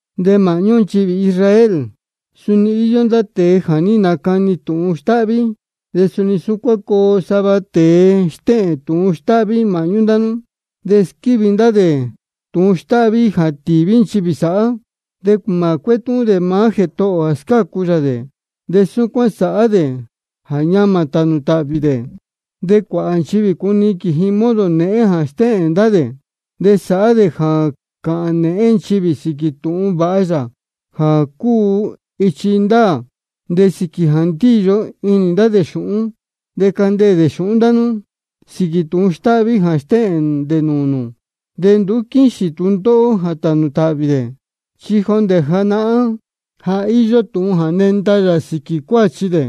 De māhñú nchivī Israel suni nī īyo ndá tēe jā ní nacani tūhun stáhví. De suni súcuán coo sava tēe stéhēn tūhun stáhví māhñú ndá nú. De squívi ndá dē tūhun stáhví jā tīví nchivī sāhá. De mā cuétúhún dē maá Jētohō ō jā scácu yā dē, de súcuán sāhá dē jā ñamā tānū tāhvī dē. De cuāhā nchivī cuniquīn ji modo nēhén jā stéhēn ndá dē. De sāhá dē jā cāhān nēhén nchivī sīquī tūhun vāha yā jā cúu ichi ndāā. De sīquī jā ndíyo inī ndá dē xūhún, de candeē dē xūhún ndá nú sīquī tūhun stáhví jā stéhēn dē nūū nū. De nduú quíxīn tūndóhó jā tānū tāhvī dē, chi jondē janahán ja íyó tūhun jā nenda yā sīquī cuāchi dē.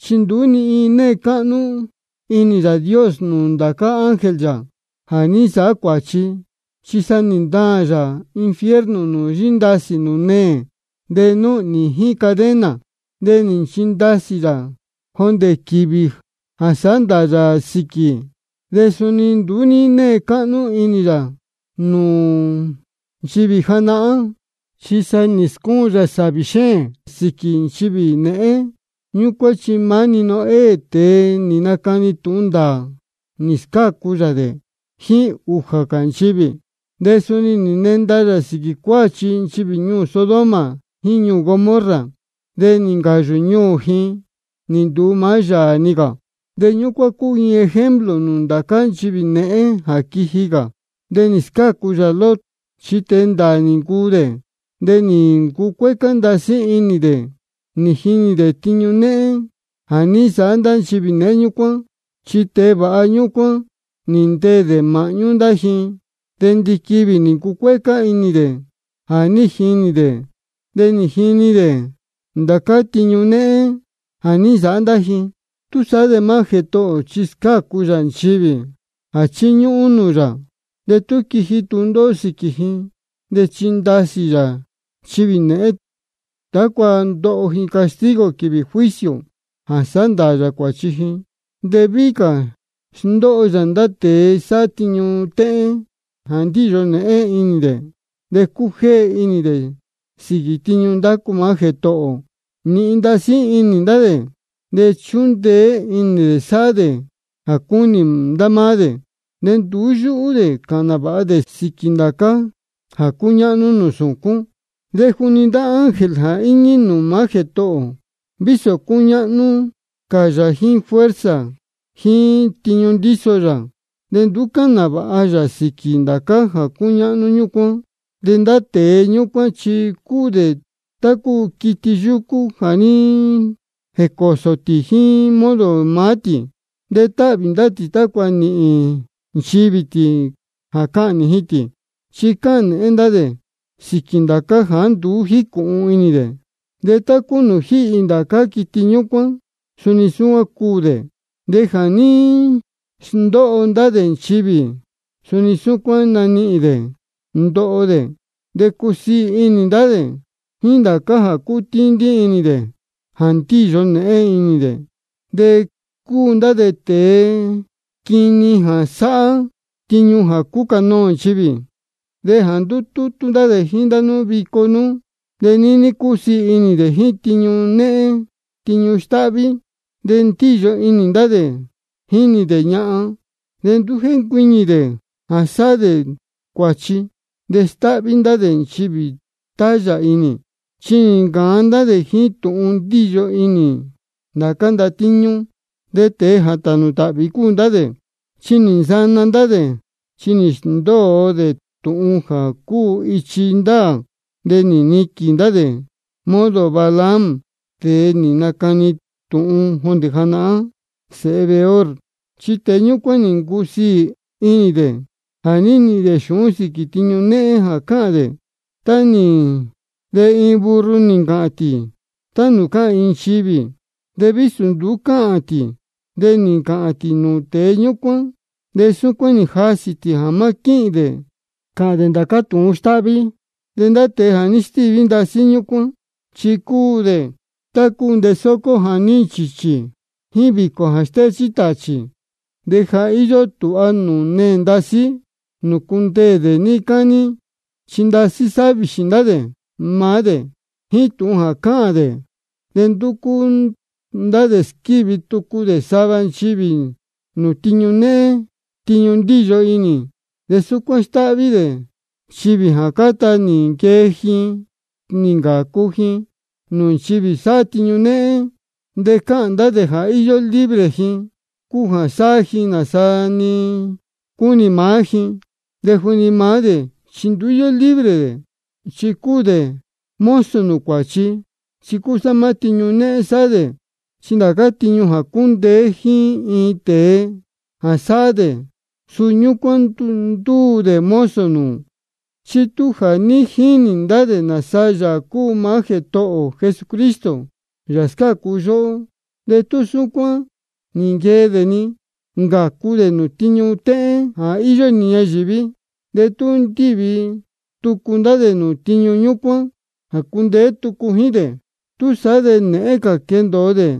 Chi nduú ní née cáhnú inī Yāā Dios nūū ndācá ángel yā jā ní nsāhá cuāchi, chi sa nī ntaān yā infierno nūū yíndasī nūū neē, de núhnī jíín cadena. De nī nchindasī yā jondē quīvī jā sāhá ndāā yā sīquī. De suni nduú ní née cáhnú inī yā nūū nchivī janahán, chi sa nī scúun yā sāvī xéēn sīquī nchivī nēhén ñúcuán. Chi maá-ni Noé, tēe nī nacani tūhun ndāā, nī scácu yā dē jíín ūjā cā nchivī. De suni nī nenda yā sīquī cuāchi nchivī ñuū Sodoma jíín ñuū Gomorra, de nī ncāyū ñuū ji nī nduu maá yāā-ni cā. De súcuán cúu ji iin ejemplo nūū ndá cā nchivī nēhén jā quiji cā. De nī scácu yā Lot, chi tēe ndāā nī ncuu dē, de nī ncucuécá ndasí inī dē nī jinī dē tiñu néhén jā ní nsāhá nchivī nēhén ñúcuán. Chi tēe vāha ñúcuán nī ndeē dē māhñú ndá ji, de ndiquivī nī ncucuécá inī dē jā ní jinī dē de nī jini dē ndācá tiñu néhén jā ní nsāhá ndá ji. Túsaá de maá Jētohō ō chi scácu yā nchivī jā chíñúhún nūū yā, de tú quiji tūndóhó sīquī ji. De chíndasī yā nchivī nēhén, tácua ndoho ji castigo quīvī juicio jā sāhá ndāā yā cuāchi ji. De víhí cā sndóho yā ndá tēe sáhá tiñu téhén jā ndíyo nēhén inī dē, de cújéhe inī dē sīquī tiñu ndácu maá Jētohō ō. Nīhin ndasí inī ndá dē, de chúndeé inī dē sáhá dē jā cúnī ndá máá dē, de nduú yúhú dē cāhān nāvāha dē sīquī ndācá jā cúñáhnú nūū sūcún. De juni ndá ángel jā íñí nūū maá Jētohō ō, vísō cúñáhnú cā yā jíín fuerza jíín tiñu ndíso yā, de nduú cáhān nāvāha yā sīquī ndācá jā cúñáhnú ñúcuán. De ndá tēe ñúcuán chi cúu dē tá cúu quiti yúcú jā ní jēcōo tī jíín modo maá tī, de táhvī ndá tī tácua nīhīn nchivī tī jā cahnī ji tī. Chi cáhān nēhén ndá dē sīquī ndācá jāá nduú jícūhun inī dē. De tá cúu nūū jíhī ndācá quiti ñúcuán, suni súcuán cuū dē. De jā ní sndóho ndá dē nchivī, suni súcuán nanihīn dē ndoho dē. De cúsiī inī ndá dē jíín ndācá jā cútíndí inī dē jā ndíyo nēhén inī dē. De cúu ndá dē tēe quini jā sáhá tiñu jā cúcanoō nchivī. De jā ndútútú ndá dē jíín nú vico nú, de níní cúsiī inī dē jíín tiñu néhén tiñu stáhví. De ndíyo inī ndá dē jínī dē ñahan, de nduú jéncuiñī dē jā sáhá dē cuāchi. De stáhví ndá dē nchivī tayā inī. Chi nī ncāan ndá dē jíín tūhun ndíyo inī dē ndācá ndatíñú. De tēe jā tānū tāhvī cúu ndá dē. Chi nī nsana ndá dē, chi nī sndóo dē tūhun jā cúu ichi ndāā. De nī niquīn ndá dē modo Balaam, tēe nī nacani tūhun jondē janahán, sēhe Beor. Chi tēe ñúcuán nī ncusiī inī dē jā nīhīn dē xūhún sīquī tūhun néhén jā cāhān dē nícu. De iin burro nī ncāhān tī tá nūū cáhān iin nchivī, vísō nduú cúu cāhān tī. De nī ncāhān tī nūū tēe ñúcuán, de súcuán nī jasī tī jā má quíhīn dē cāhān dē ndācá tūhun néhén stáhví. De ndá tēe jā stíví ndasí súcuán, chi cúu dē tá cúu ntesócó jā ní nchīchī, jíín vīcō jā stéchí tāchī. De ja íyó tūha nūū neē ndasí nūū cundeē dē níí cání. Chi ndasí sáhá vīxī ndá dē maá dē jíín tūhun jā cáhān cāhá dē. De ndúcú ndá dē squívi tucu dē sava nchivī nūū tiñu néhén tiñu ndíyo inī. De súcuán stáhví dē nchivī jā cáta nī nquee ji nī ncācu ji nūū nchivī sáhá tiñu néhén. De cáhān ndá dē jā íyó libre ji jā cuu sāhá ji nāsa-ni cúnī maá ji, de juni maá dē chi nduú íyó libre dē, chi cúu dē mozo nūū cuāchi, chi cúsá maá tiñu téhén sáhá dē. Chi ndācá tiñu jā cúndeé jíín iin tēe jā sāhá dē, suu ñúcuán ndúu dē mozo nūū. Chi tú ja nī jinī ndá dē nāsa Yāā cúu maá Jētohō ō Jesucristo, Yāā jā scácu yóhó, de tú súcuán nī nquee dē nī ncācu dē nūū tiñu téhén jā íyó inī ñayīví, de tú ndīvi tucu ndá dē nūū tiñu ñúcuán jā cundeé tucu jíín dē, túsaá de nēhén cā quendōo dē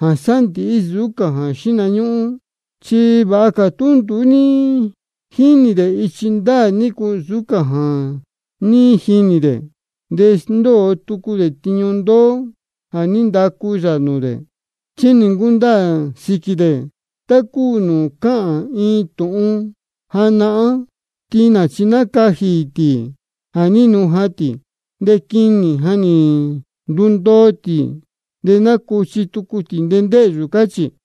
jā sándīhí nsūú cā jā xíhna ñúhún. Chi vāha cā tú nduú ní jínī dē ichi ndáā nícu, nsūú cā jā ní jinī dē, de sndóo tucu dē tiñu ndoo jā ní ndacu yā nūū dē. Chi nī ncundaā sīquī dē tá cúu nūū cáhān iin tūhun janahán: Tinā nī nacajī tī jā ní nujan tī. De quinī jā ní ndundoo, nī nacuchi tucu tī ndēhyū, cáchī.